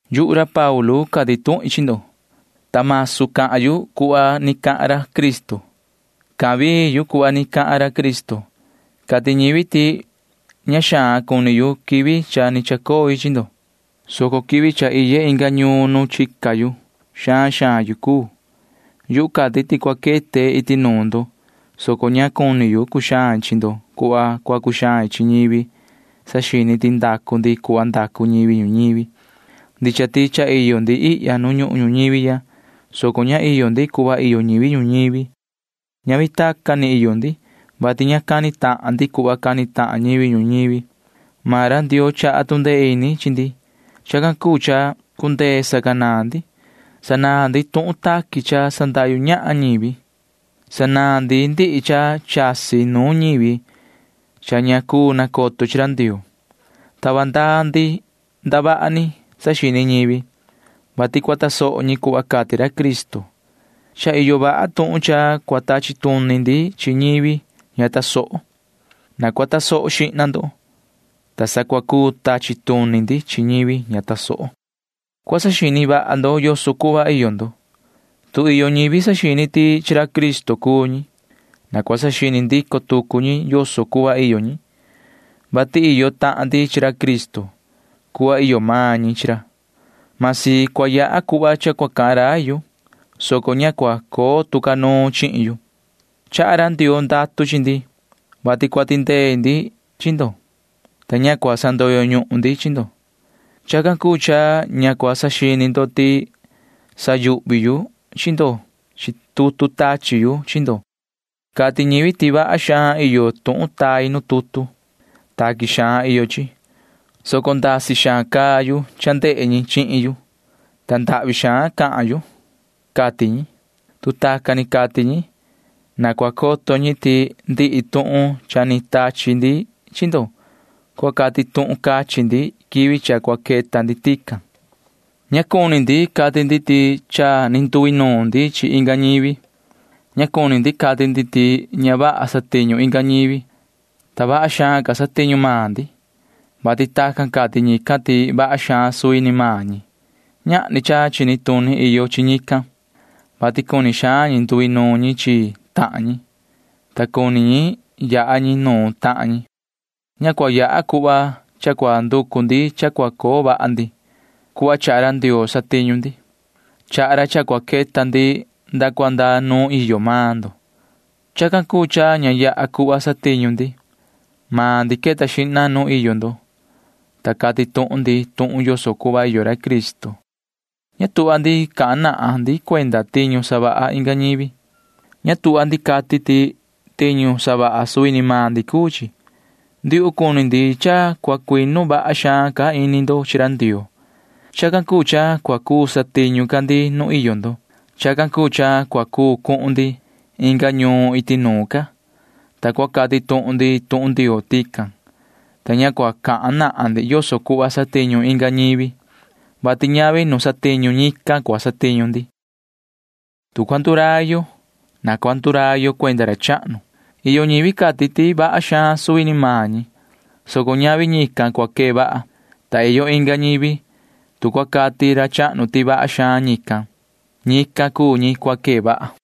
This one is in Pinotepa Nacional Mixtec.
Yuhu ra Paulu cati tuhin chi ndo, ta masu cahan yu cuhva ni cahan ra Cristo. Cahan vii yu cuhva ni cahan ra Cristo. Cati ñivi ti ña xaan cuni yu quivi cha ni chacoi chi ndo, soco quivi cha iye inga ñuun nu chica xaan xaan yu cuu. Yuhu cati ti cua quete iti nuun ndo, soco ña cuni yu cuxain chi ndo cuhva cua cuxain chi ñivi saxini ti ndacu ndi cuhva ndacu ñivi ñuñivi. Ndicha ti cha iyo ndi ihya nu ñuhun ñuñivi ya, soco ña iyo ndi cuhva iyo ñivi ñuñivi. Ñavi tacan ni iyo ndi, vati ña cani tahan ndi cuhva cani tahan ñivi ñuñivi. Maan ra Ndioo chaha tu ndee ini chi ndi. Chacan cuu cha cundee sacanaan ndi. Sanaan ndi tuhun taqui cha sandahyu ñahan ñivi. Sanaan ndi ndihi cha chasi nuun ñivi cha ña cuu nacoto ñi chi ra Ndioo. Tava ndaa ndi ndavaha ni saxini ñivi, vati cua tasoho ñi cuhva cati ra Cristo. Cha iyo vaha tuhun cha cua tachi tuni ndi chi ñivi ña tasoho. Na cua tasoho xihna ndo, ta sa cua cuu tachi tuni ndi chi ñivi ña tasoho. Cua saxini vaha ndo yoso cuhva iyo ndo. Tu iyo ñivi saxini ti chi ra Cristo cuu ñi, na cua saxini ndico tucu ñi yoso cuhva iyo ñi, vati iyo tahan ndi chi ra Cristo cuhva iyo maan ñi chi ra. Masi cua yaha cuhva cha cua cahan rai yu, soco ña cua coo tu ca nuun chihin yu. Chaha ra Ndioo ndatu chi ndi, vati cua tindee ndi chi ndo, ta ña cua sandoyo ñuhun ndi chi ndo. Chacan cuu cha ña cua saxini ndo ti sayuhvi yu chi ndo chi tutu tachi yu chi ndo. Cati ñivi ti vaha xaan iyo tuhun tai nu tutu. Taqui xaan iyo chi, soco ndasi xaan caa yu cha ndehe ñi chihin yu, ta ndahvi xaan cahan yu, cati ñi. Tu tacan ni cati ñi, na cua coto ñi ti ndihi tuhun cha ni tachi ndi chi ndo cua cati tuhun cachin ndi quivi cha cua queta ndi tican. Ña cuni ndi cati ndi ti cha ni nduinuun ndi chi inga ñivi. Ña cuni ndi cati ndi ti ña vaha satiñu inga ñivi, ta vaha xaan ca satiñu maan ndi, vati tacan cati ñican ti vaha xaan suvi ni maan ñi. Ñahni cha chini tuni iyo chi ñican, vati cuni xaan ñi nduinuun ñi chi tahan ñi, ta cuni ñi yaha ñi nuun tahan ñi. Ña cua yaha cuhva cha cua nducu ndi cha cua coo vaha ndi. Cuhva chaha ra Ndioo satiñu ndi. Chaha ra cha cua queta ndi nda cua nda nuun iyo maan ndo. Chacan cuu cha ña yaha cuhva satiñu ndi. Maan ndi queta xihna nu iyo ndo, ta cati tuhun ndi tuhun yoso cuhva iyo ra Cristo. Ña tuhva ndi cahan nahan ndi cuenda tiñu savaha inga ñivi. Ña tuhva ndi cati ndi ti tiñu savaha suvi ni maan ndi cuu chi. Ndiuhu cuni ndi cha cua cuinu vaha xaan ca ini ndo chi ra Ndioo. Chacan cuu cha cua cuu satiñu ca ndi nu iyo ndo. Chacan cuu cha cua cuu cuhun ndi inga ñuun iti nuun ca, ta cua cati tuhun ndi tuhun Ndioo tican, ta ña cua cahan nahan ndi yoso cuhva satiñu inga ñivi, vati ñavi nu satiñu ñican cua satiñu ndi. Tu cua ndurai yo, na cua ndurai yo cuenda ra chahnu. Iyo ñivi cati ti vaha xaan suvi ni maan ñi, soco ñavi ñican cua quee vaha. Ta iyo inga ñivi―tu cua cati ra chahnu ti vaha xaan ñican, ñican cuu ñi cua quee vaha.